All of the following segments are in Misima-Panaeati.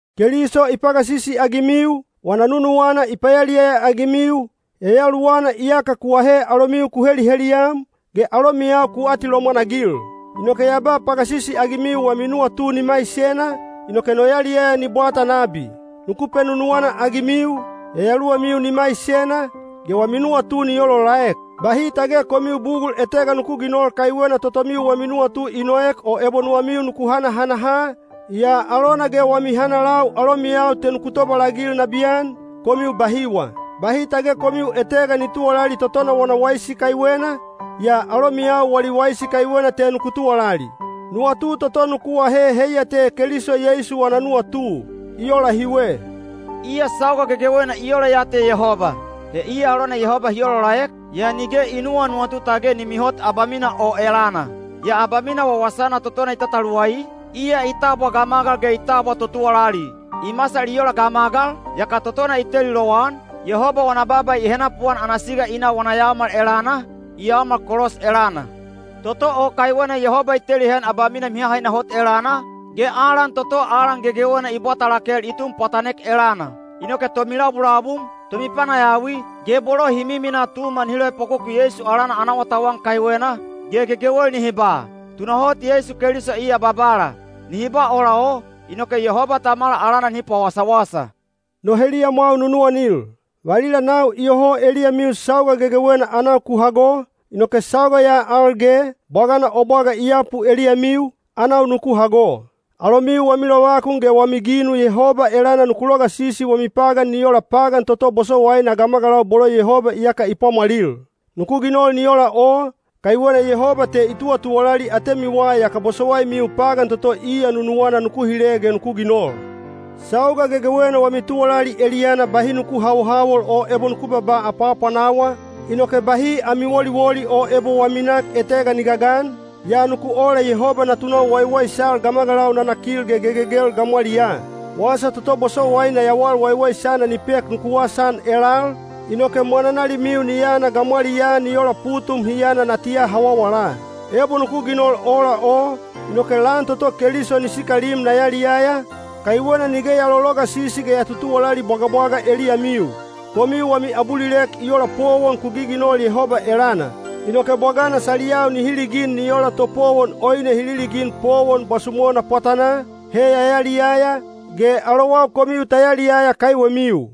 Keliso i pagasisi-agimiu, wana nunuwana i payaliyaya-agimiu, Yayaluwana iyaka ku ahe alomiu ku heliheliyam, ge alomiyau ku atilomwan-agil. Inoke ya ba pagasisi-agimiu wami nuwatu ni maisena, inoke no yaliyaya ni bwata nabi. Nuku penunuwana-agimiu, yayaluwamiu ni maisena, ge wami nuwatu ni olaolaek. Bahi tage komiu bugul etega nuku ginol kaiwena totomiu wami nuwatu i noek o ebo nuwamiu nuku hanahanaha, yaa alona ge wami hanalau alomiyau te nuku tobalagil nabiyan, komiu bahiwa. Bahi tage komiu etega ni tuwalali totona wana waisi kaiwena, yaa alomiyau wali waisi kaiwena te nuku tuwalali. Nuwatu toto nuku ahe heiya te Keliso Yeisu wana nuwatu. I ola hiwe: Iya sauga gegewena i ola ya te Yehoba, he iya alona Yehoba hi olaolaek, yaa nige i nuwanuwatu tage ni mihot abamina o elana. Yaa abamina wawasana totona i tataluwai, iya i tabwa gamagal ge i tabwa totuwalali. I masal i ola gamagal, yaka totona i teli lowan, Yehoba wana baaba i henapuan ana siga i na wana yaomal elana, i yaomal kolos elana. Toto o kaiwena Yehoba i teli heyan abamina mihahaina hot elana, ge alan toto alan gegewena i bwata lakel i tun pwatanek elana. Inoke tomilabulabum, tomipanayawi, ge bolo hi miminaa Tuma nihi loepwakoku Yeisu alana ana awatauwan kaiwena, ge gegewel nihi ba, “Tunahot Yeisu Keliso iya Babala.” Nihi ba ola o, inoke Yehoba Tamala alana nihi pawasawasa. No heliyamwau nunuwanil, valila nau iyoho eliyamiu sauga gegewena anau ku hago, inoke sauga ya al ge, bwagana o bwaga i yapu eliyamiu, anau nuku hago. Alomiu wami lovakun ge wami ginu Yehoba elana nuku logasisi wami pagan ni ola pagan toto bosowaina gamagalau bolo Yehoba iyaka i pwamwalil. Nuku ginol ni ola o, kaiwena Yehoba te i tuwatuwalali atemiwa yaka bosowaimiu pagan toto iya nunuwana nuku hile ge nuku ginol. Sauga gegewena wami tuwalali eliyana bahi nuku hawohawol o ebo nuku babaa apwaapwanawa, inoke bahi ami woliwoli o ebo wami nak etega ni gagan, yaa nuku ola Yehoba natunau waiwaisal gamagalau nanakil ge gegegel gamwaliyaa. Wasa toto bosowaina yawal waiwaisana ni pek nuku wasaan elal, inoke mwananalimiu ni yana gamwaliyaa ni ola putum hi yana natiya hawawala. Ebo nuku ginol ola o, inoke lan toto Keliso ni sikalim na yaliyaya, kaiwena nige ya lologasisi ge ya tutuwalali bwagabwaga eliyamiu. Komiu wami abulilek i ola powon ku giginol Yehoba elana. Inoke bwagana saliyau nihi ligin ni ola topowon oine hi liligin powon bwasumona pwatanaa, he ya yaliyaya, ge alowau komiu ta yaliyaya kaiwemiu.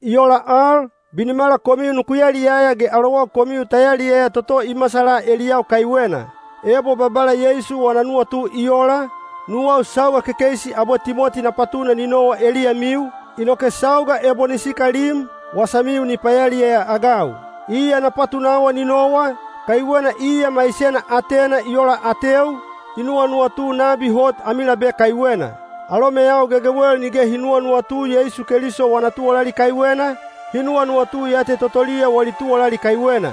I ola al, binimala komiu nuku yaliyaya ge alowau komiu ta yaliyaya toto i masala eliyau kaiwena. Ebo Babala Yeisu wana nuwatu i ola, nuwau sauga kekeisi abwe Timoti na patuna ni nowa eliyamiu, inoke sauga ebo ni sikalim, wasamiu ni payaliyaya-agau. Iya na patunawa ni nowa, kaiwena iya maisena atena i ola ateu, i nuwanuwatu nabi hot ami labe kaiwena. Alomeyau gegewel nige hi nuwanuwatu Yeisu Keliso wana tuwalali kaiwena, hi nuwanuwatu ya te totoliya wali tuwalali kaiwena.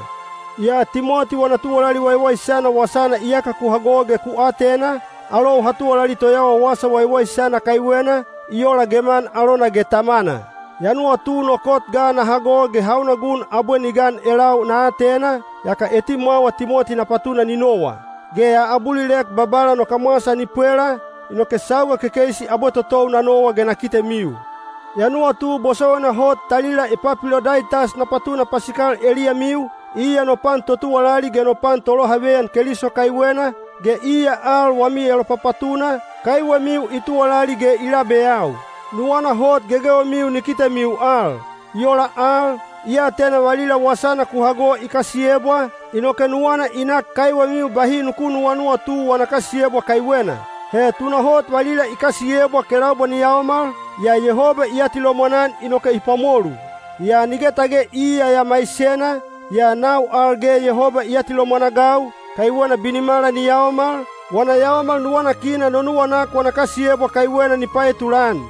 Yaa Timoti wana tuwalali waiwaisana wasana iyaka ku hago ge ku atena, alou ha tuwalali toyawa wasa waiwaisana kaiwena, i ola geman alona ge tamana. Ya nuwatu no kot ga na hago ge hauna gun abwe ni gan elau na atena, yaka etimwawa Timoti na patuna ni nowa. Ge ya abulilek Babala no kamwasa ni pwela, inoke sauga kekeisi abwe totou na nowa ge na kitemiu. Ya nuwatu bosowaina hot talila Epapilodaitas na patuna pasikal eliyamiu, iya no pan totuwalali ge no pan tolohaveyan Keliso kaiwena, ge iya al wami elopapatuna, kaiwemiu i tuwalali ge i labeyau. Nuwana hot gegewemiu ni kitemiu al. I ola al, i atena valila wasana ku hago i kasiyebwa, inoke nuwana i nak kaiwemiu bahi nuku nuwanuwatu wana kasiyebwa kaiwena. He tunahot valila i kasiyebwa kelaubwa ni yaomal, yaa Yehoba i atilomwan-an inoke i pwamolu. Yaa nige tage iya ya maisena, yaa nau al ge Yehoba i atilomwan-agau, kaiwena binimala ni yaomal, wana yaomal nuwanakina no nuwanak wana kasiyebwa kaiwena ni paetulan.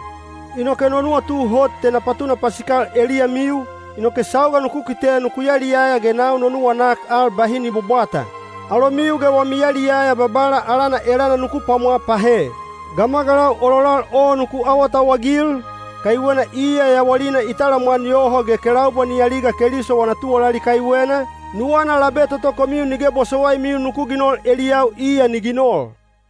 Inoke no nuwatu hot te na patuna pasikal eliyamiu, inoke sauga nuku kite nuku yaliyaya ge nau no nuwanak al bahi ni bwabwata. Alomiu ge wami yaliyaya Babala alana elana nuku pwamwa pahe. Gamagalau ololal o nuku awatauwagil, kaiwena iya yawalina i talamwan yoho ge kelaubwa ni aliga Keliso wana tuwalali kaiwena, nuwana labe toto komiu nige bosowaimiu nuku ginol eliyau iya ni ginol.